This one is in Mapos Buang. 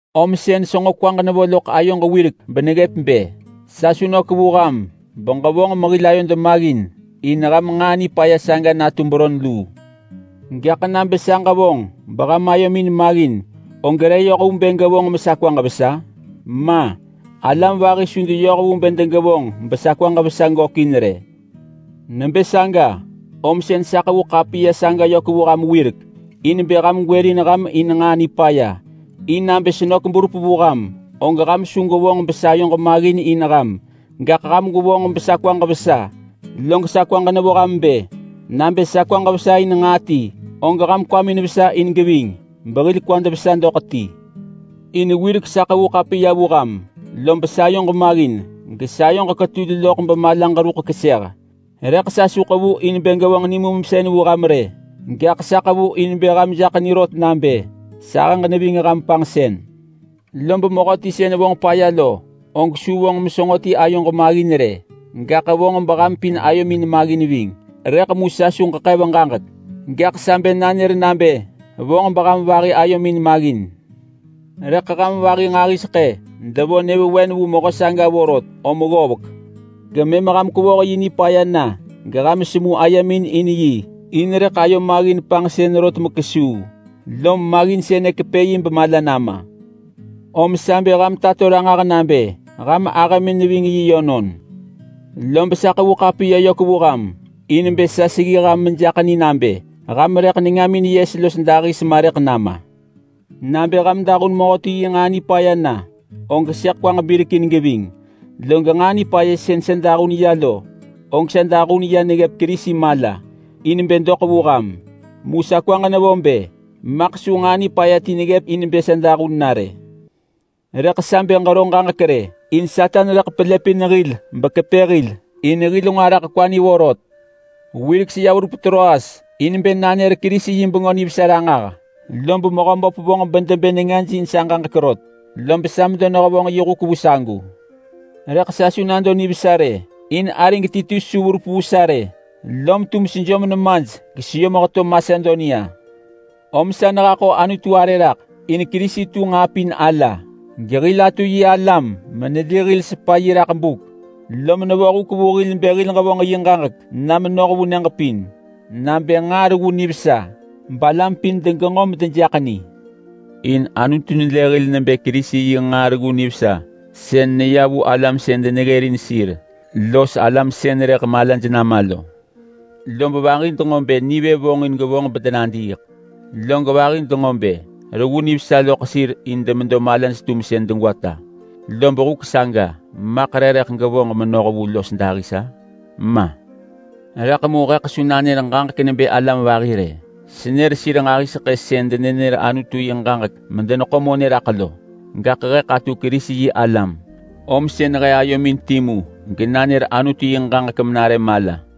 Om sën senġo kwaġ nevo loḳ ayoġ wirek beneggëp bë sa su nök vu ham beġevonġ mehil ayod maggin in ham nġaa nipaya saga natu beron luu. Gaḳ nabë sa ġevonġ beham ayomin maggin, og re yoh vu bë gevonġ mesa kwaġ vesa? Ma! Alam vahi su deyoh vu bë degevonġ besa kwaġ vesa gökin rë. Nebë saga om sën sa ḳevu ḳapiya saga yök vu ham wirek in bë ham gwërin ham in nġaa nipaya. In nabë senök berup vu ham, og ham su gwevonġ besayoġ maggin in ham, gaḳ ham gwevonġ besa kwaġ vesa. Log sa kwaġ nevo ham nebë: Nabë sa kwaġ vesa in nġaa ti, og ham kwamin vesa geving behil kwad vesa doḳ ti. In wirek sa ḳevu ḳapiya vu ham, lob sayoġ maggin gesa ayoġ ketul loḳ bemalaġ ruḳ keseh, rëḳ sa su ḳevu in bë ġevonġ nimumsën vu ham rë, gaḳ sa ḳevu in bë ham jaḳ ni rot nabë sahëġ neving ham panġsën. Lob mehöti sën vonġ paya lo, og su vonġ mesenġo ti ayoġ maggin rë. Gaḳ vonġ beham pin ayomin maggin ving,—rëḳ mu sa su ġeḳev ġaġek, gaḳ sa bë nanër nabë vonġ beham vahi ayomin maggin. Rëḳ ham vahi nġahiseḳë devo nyëvewen vu mehö saga vorot om ggovek, gemëm ham kwevoh yi nipaya na geham semu ayemin in yi, in rëḳ ayo maggin panġsën rot mekesuu, lom maggin sënë kepë yi bemala nama. Om sa bë ham tato ranġah nabë ham ahëmin neving yi yönon. Lob sa ḳevu ḳapiya yök vu ham in bë sa seggi ham mesejaḳ ni nabë, ham rëḳ nengamin yes los dahis ma rëḳ nama! Nabë ham dahun mehöti yi nġaa nipaya na, og sëḳ kwaġ birekin geving. Log nġaa nipaya sën sa dahun ya lo, og sa dahun ya neggëp Kerisi mala in bë doḳ vu ham. Mu sa kwaġ nevo bë maḳ su nġaa nipaya ti neggëp in bë sa dahun na rë. Rëḳ sa bë ġero ġaġek rë, in Satan rëḳ pelëpin hil bekepë hil. In hil nġo araḳ kwa ni vorot. Wirek seya verup Troas in bë nanër Kerisi yi Bengö Nivesa ranġah, lob Mehöböp vonġ bedebë nengaj in sa ġaġek rot, lob sa medo nehevonġ yi huk vu sagu. Rëḳ sa su nado nivesa rë, in arig Titus su verup vu sa rë. Lom tum sejom nemaj geseyom heto Masedonia. Om sa nehaḳo Anutu arë raḳ in Kerisi tu nġaa pin ala gehil atu yi alam meneli hil ving yi raḳ buk. Lom nevo huk vu hil bë hil ġevonġ yi ġaġek na menoh vu nyëġ pin nabë nġaa reggu nivesa balam pin degenġo medejaḳ ni. In Anutu nelë hil nebë Kerisi yi nġaa reggu nivesa sën neya vu alam sën deneggërin sir los alam sën rëḳ malaj nama lo. Lob vahi denġo bë nivë vonġin gevonġ medenadiiḳ, log vahi denġo bë reggu nivesa loḳ sir in demedo malaj-tumsën degwata. Lob huk saga maḳ re rëḳ gevonġ menoh vu los dahis-a? Ma! Rëḳ mu heḳ su nanër ġaġek nebë alam vahi rë. Senër sir nġahiseḳë sën denenër Anutu yi ġaġek medeneḳo monë raḳ lo. Gaḳ heḳ atu Kerisi-yi-alam, om sën he ayomin timu genanër Anutu yi ġaġek menare mala.